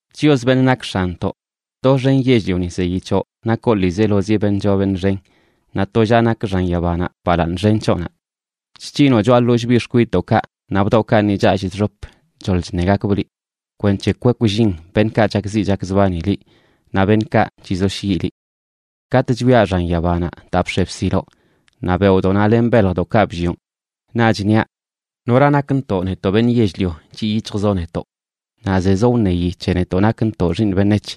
Chios, beṉꞌ nak X̱anntoꞌ, doxen yell-lioni zeyi c̱hoꞌ nakoꞌ ḻiizelozi beṉꞌ choo beṉꞌ xen, naꞌ tollaꞌ nak xan yabanaꞌ balaaṉ xen c̱hoꞌnaꞌ. Chc̱hinoꞌ choꞌa ḻollꞌ biꞌ xkwidꞌdoꞌkaꞌ naꞌ bdoꞌkaꞌ ni challꞌ chxop choḻ chṉegakbꞌ liꞌ, kwenc̱he kwekllin beṉꞌkaꞌ chakziꞌ chakzbani liꞌ naꞌ beṉꞌkaꞌ chizoshyiꞌ liꞌ. Katꞌ chwiaꞌ xan yabanaꞌ daa bx̱e bsiloꞌ, naꞌ beoꞌdoꞌnaꞌ len beljdoꞌkaꞌ bllioꞌn, naꞌch niaꞌ: ¿Nora nakntoꞌ, netoꞌ beṉꞌ yell-lio, chiꞌ yic̱hjzoꞌ netoꞌ, naꞌ zezoꞌ wṉeyi c̱he netoꞌ nakntoꞌ xiiṉ beṉec̱h?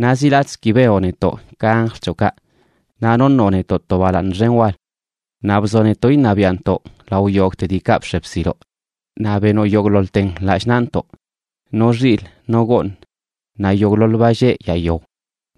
Naꞌ zi latꞌzə ki benoꞌ netoꞌ ka anjl c̱hoꞌkaꞌ, naꞌ noṉoꞌ netoꞌ to balaaṉ xen wal. Naꞌ bzoꞌ netoꞌ iṉabiaꞌntoꞌ lao yogꞌte diikaꞌ bx̱e bsiloꞌ, naꞌ benoꞌ yogꞌḻoḻten lallꞌ naꞌntoꞌ: no xilꞌ, no gooṉ, naꞌ yogꞌḻoḻ ba lleꞌ yaa yao,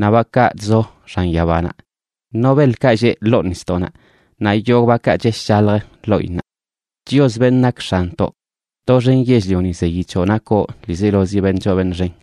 no bakaꞌ chzo xan yabanaꞌ, no beḻkaꞌ lleꞌ ḻoo nisdoꞌnaꞌ, naꞌ yogꞌ bakaꞌ chesh chalj ḻoꞌinnaꞌ. Chios, beṉꞌ nak X̱anntoꞌ, ¡doxen yell-lioni zeyi c̱hoꞌ nakoꞌ ḻiizelozi beṉꞌ choo beṉꞌ xen!